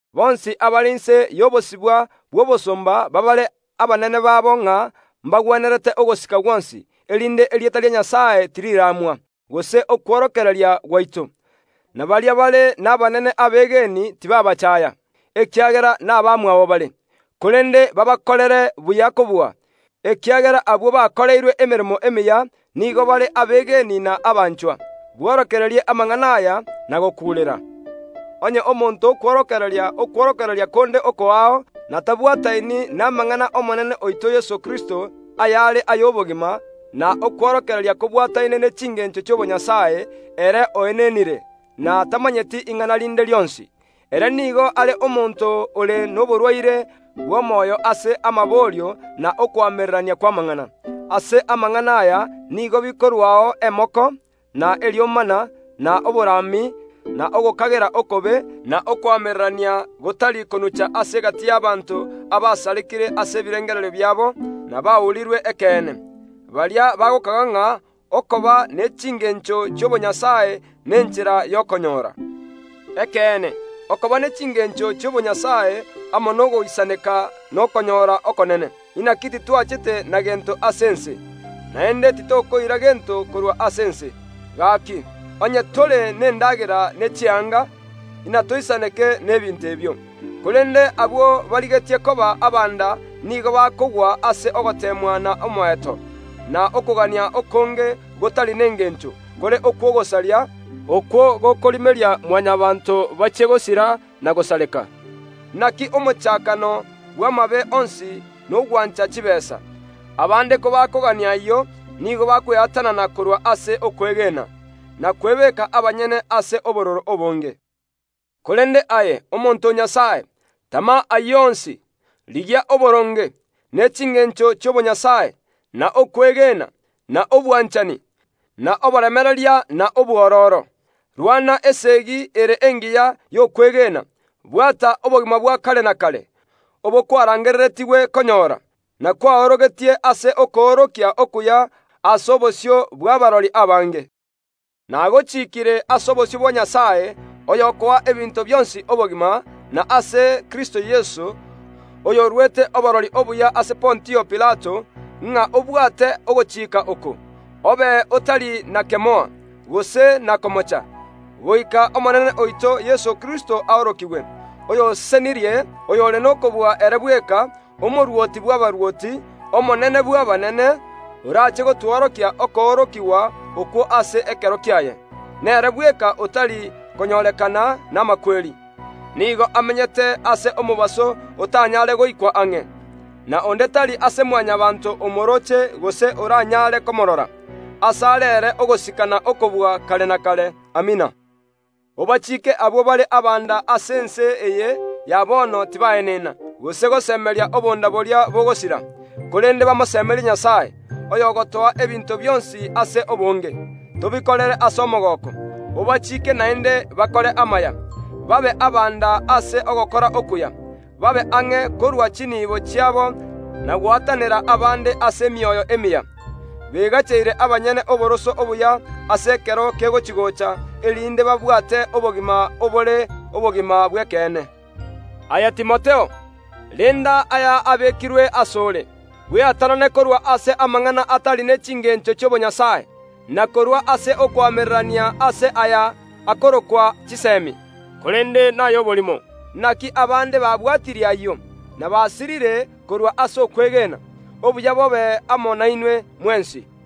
Bonsi abare inse y’obosibwa bw’obosomba baabare abanene babo ng’a mbagwenerete ogosika gwonsi, erinde erieta ria Nyasae tiriramwa, gose okworokereria gwaito. Na baria bare nabanene abegeni tibaabachaaya ekiagera nabamwabo bare, korende baabakorere buya kobua, ekiagera abwo bakoreirwe emeremo emiya nigo bare abegeni na abanchwa. Bworokererie amang’ana aya, na gokuurera. Onye omonto okworokereria konde okoao, na tabwataini namang’ana a Omonene oito Yeso Kristo, ayare y’obogima, na okworokereria kobwataine ne chingeencho chi’obonyasae, ere oenenire, na tamanyeti ing’ana rinde rionsi. Ere nigo are omonto ore noborwaire bw’omoyo ase amaborio na okoamererania kw’amang’ana. Ase amang’ana aya nigo bikorwao emoko, na eriomana, na oborami, na ogokagera okobe, na okoamererania gotari konucha ase egati y’abanto abasarekire ase ebirengererio biabo, na baurirwe ekeene. Baria bagokaga ng’a okoba ne chingencho chi’obonyasae nenchera y’okonyora. Ekeene, okoba ne chingencho chi’obonyasae amo nogoisaneka nokonyora okonene, inaki titwachete na gento ase ense, naende titokoira gento korwa ase ense. Gaaki, onye tore nendagera ne chianga, inatoisaneke n’ebinto ebio. Korende abwo barigetie koba abanda nigo bakogwa ase ogoteemwa na omoeto, na okogania okonge gotari nengeencho, kore okw’ogosaria, okwo gokorimeria Mwanyabaanto bachie gosira na gosareka. Inaki omochakano bw’amabe onsi nogwancha chibeesa. Abaande kobakogania ayio, nigo bakweatanana korwa ase okwegena, na kwebeeka abanyene ase obororo obonge. Korende aye, omonto o Nyasae, tama ayio onsi, rigia oboronge, ne chingeencho chi’obonyasae, na okwegena, na obwanchani, na oboremereria na obwororo. Rwana esegi ere engiya y’okwegena, bwata obogima bwa kare na kare, obo kwarangereretigwe konyora, na kwaorogetie ase okoorokia okuya ase obosio bw’abarori abange. Nagochiikire ase obosio bwa Nyasae, oyokoa ebinto bionsi obogima, na ase Kristo Yeso, oyoruete oborori obuya ase Pontio Pilato, ng’a obwate ogochika oko, obe oy’otari na kemoa, gose na komocha, goika Omonene oito Yeso Kristo aorokigwe. Oyosesenirie, oyore nokobua ere bweka, Omorwoti bw’abarwoti, Omonene bw’abanene, oraache gotworokia okoorokigwa okwo ase ekero kiaye. Nere bweka otari konyorekana namakweri, nigo amenyete ase omobaso otanyaare goikwa ang’e, na onde tari ase Mwanyabaanto omorooche gose oranyare komorora. Asare ere ogosika na okobua kare na kare. Amina. Obachiike abwo bare abanda ase ense eye ya bono tibaenena, gose gosemeria obonda boria bogosira, korende bamosemerie Nyasae, oyogotoa ebinto bionsi ase obonge, tobikorere ase omogooko. Obachiike naende bakore amaya, babe abanda ase ogokora okuya, babe ang’e korua chinibo chiabo, na gwatanera abaande ase emioyo emiya, beagacheire abanyene oboroso obuya ase ekero kegochia-gocha erinde babwate obogima obore obogima bw’ekeene. Aye Timotheo, renda aya abekirwe ase ore. Bweatanane korwa ase amang’ana atari ne chingeencho chi’obonyasae, na korwa ase okoamererania ase aya akorokwa chisemi, korende nay’oborimo. Inaki abaande babwatirie ayio, na basirire korwa ase okwegena. Obuya bobe amo nainwe mwensi.